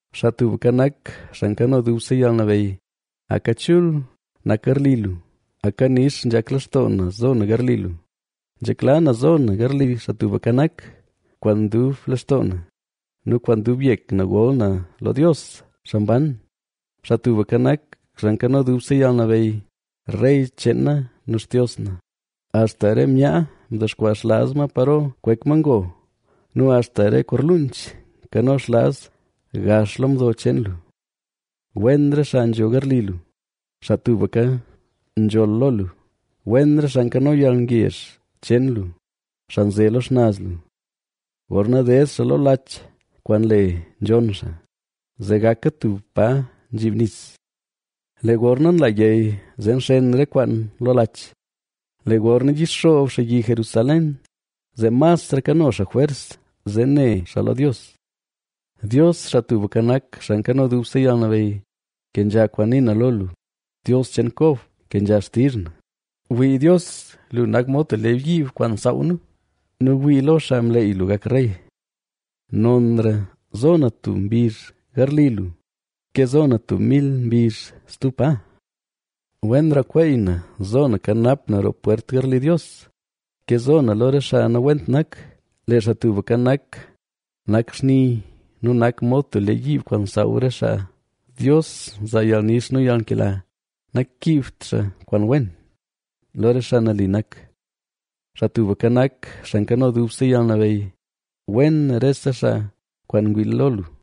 ¡Xaa Tubka Nak, Xaa Nkano Dubse Yalnabeyy, aka chul nak garli lu! ¡Aka nix nzhak lextoo na zo na garli lu, Nzhekla na zo na garli Xaa Tubka Nak! ¡Kwaan dub lextoo na nu kwaan dub yek na gol na lo Dios, xaa mban! Xaa Tubka Nak, Xaa Nkano Dubse Yalnabeyy, rey cheen na nu Xtios na, axta re myaa ndexkwaa xlaaz paro kwek ma ngo nu axta re korluunch nkano xlaaz gax lo mdo cheen lu. ¡Wen re xaa nzho garli lu, xaa tubka nzholl lo lu! Wen re xaa nkano yalngezh cheen lu, xaa nze lo xnaz lu. Gorna ded xaa lo lach kwaan le Nzhonn Xaa, zee gaka tub pa nzhiib nis, lee gorna nla yey zee nxen re kwaan lo lach. Lee gorna yixoob xaa yi Jerusalén zee masra kano xaa jwers, zee ne xaa lo Dios. Dios, Xaa Tubka Nak, Xaa Nkano Dubse Yalnabeyy, kenzha kwaan nii na lo lu; ¡Dios cheen Kob, kenzha xtizh na! Wii Dios, lu nak mod tub lee yiib kwaan nsaaw nu nu wii lo xaa mleey lu gak rey. Nonra zo na tub mbizh garli lu, ke zo na tub mil mbizh stub pa. ¡Wenra kweey na zo na kanap na roo pwert garli Dios ke zo na lo re xaa nawent nak! Lee Xaa Tubka Nak, nak xni nu nak mod tub lee yiib nsaaw re xaa; Dios nzaa yalnix nu yalnkela, nankiibt xaa kwaan wen, lo re xaa nali nak. Xaa Tubka Nak, Xaa Nkano Dubse Yalnabeyy, ¡wen rese xaa kwaan ngwii lo lu!